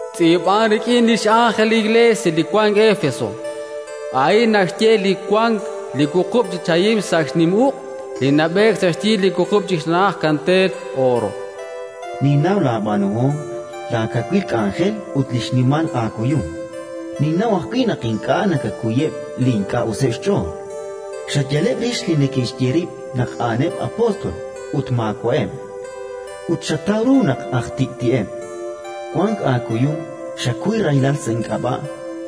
“Tz'iib'an rik'in li x'ánjel li Iklees li wank Éfeso: «A'in naxye li wank li wuqub' chi chahim sa' xnim uq', li nab'eek sa' xyi li wuqub' chi xna'aj kanteel ooro. Ninnaw laab'aanuhom, laakawil k'anjel ut li xnimal aakuyum; ninnaw ajwi' naq ink'a' nakakuyeb' li ink'a' useb' xch'ool. Xayaleb' rix li neke'xye rib' naq a'aneb' apóstol ut maawa'eb', ut xataw ru naq aj tik'ti'eb'. Wank aakuyum; xakuy rahilal sa' ink'ab'a'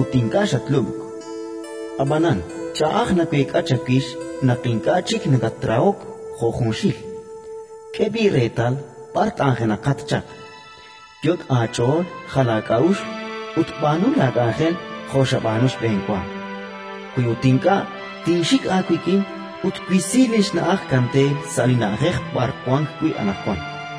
ut ink'a' xatlub'k. Ab'anan ch'a'aj naweek'a chawix naq ink'a' chik nakatrahok jo' junxil. K'e b'i' reetal b'ar t'anjenaqat chaq; yot' aach'ool jal aak'a'uxl ut b'aanu laak'anjel jo' xab'aanu xb'enwa. Wi ut ink'a', tinxik aawik'in ut twisi li xna'aj kanteel sa' li na'ajej b'ar wank wi' anaqwan.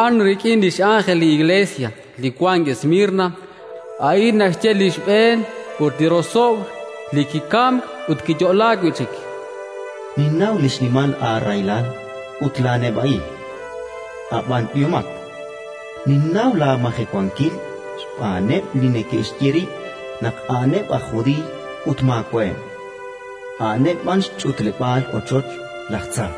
“Tz'iib'an rik'in li x'ánjel li Iklees li wank Esmirna: «A'in naxye li xb'een ut li rosob'l, li kikamk ut kiyo'laak wi' chik. Ninnaw li xnimal aarahilal ut laaneb'a'il (ab'an b'ihomat). Ninnaw laamajewankil xb'aaneb' li neke'xye rib' naq a'aneb' aj Judiiy ut maawa'eb', a'aneb' b'an xch'utleb'aal ochoch laj tza.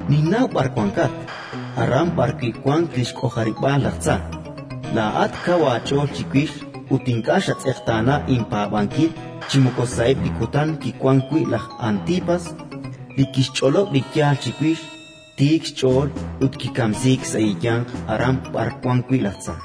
Ninnaw b'ar wankat: aran b'arwi' wank li xk'ojarib'aal laj tza. Laa'at kaw aach'ool chiwix ut ink'a' xatz'eqtaana inpaab'ankil chi moko sa'eb' li kutan kiwank wi' laj Antipas, li kixch'olob' li yaal chiwix tiik xch'ool ut kikamsiik sa' eeyanq aran b'ar wank wi' laj tza.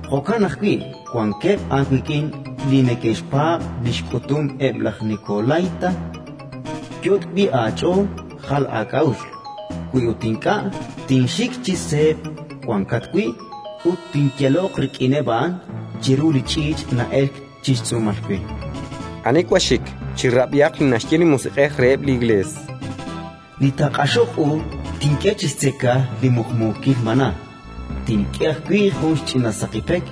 Jo'kan ajwi' wankeb' aawik'in li neke'xpaab' li xk'utum eb' laj nikolaíta. Yot' b'i' aach'ool jal aak'a'uxl. Wi ut ink'a', tinxik chi seeb' wankat wi' ut tinyaloq rik'ineb' a'an chiru li ch'iich' na'elk chi xtz'uumal we. Ani wank xxik, chirab'ihaq li naxye li Musiq'ej reheb' li Iklees: Li taaq'axoq u tink'e chi xtzeka li muqmuukil mana'. Tink'e ajwi' jun xch'ina saqi pek,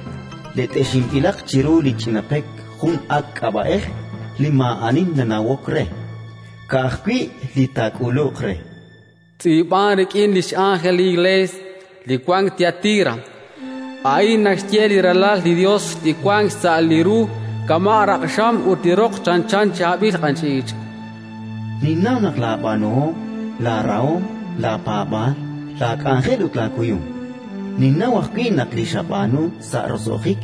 let'exinb'ilaq chiru li ch'ina pek jun ak' k'ab'a'ej li maa'ani nanawok re, ka'ajwi' li taak'uluq re». “Tz'iib'an rik'in li x'ánjel li Iklees li wank Tiatira: «A'in naxye li Ralal li Yos, li wank xsa' li ru kama' raq'xam ut li roq chanchan chaab'il q'anch'iich'. Ninnaw laab'aanuhom, laarahom, laapaab'aal, laak'anjel ut laakuyum. Ninnaw ajwi' naq li xab'aanu sa' roso'jik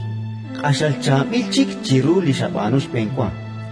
q'axal chaab'il chik chiru li xab'aanu xb'enwa.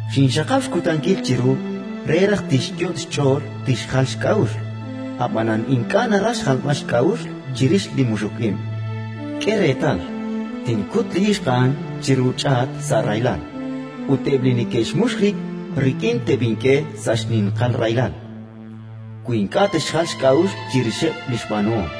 Xinxaqab' xkutankil chiru re raj tixyot' xch'ool tixjal xk'a'uxl, ab'anan ink'a' naraj xjalb'al xk'a'uxl chirix li muxuk ib'. K'e reetal, tinkut li ixq a'an chiru ch'aat sa' rahilal; ut eb' li neke'xmux rib' rik'in teb'ink'e sa' xninqal rahilal, wi ink'a' te'xjal xk'a'uxl chirixeb' li xb'aanuhom.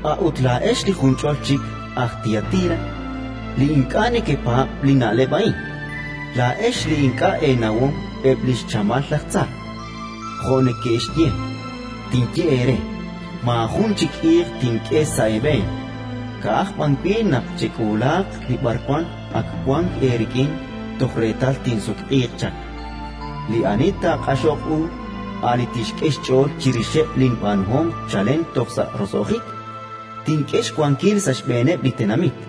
«A'ut laa'ex li junch'ol chik aj Tiatira, li ink'a' nekepaab' li na'leb' a'in, laa'ex li ink'a' eenawom eb' li xchamal laj tza, jo' neke'xye, tinye eere: Maajun chik iiq tink'e sa' eeb'een, ka'aj b'an wi' naq chek'uulaaq li b'arwan ak wank eerik'in toj reetal tinsutq'iiq chaq. Li ani taaq'axoq u, a' li tixk'e xch'ool chirixeb' linb'aanuhom chalen toj sa' roso'jik, tink'e xwankil sa' xb'eeneb' li tenamit.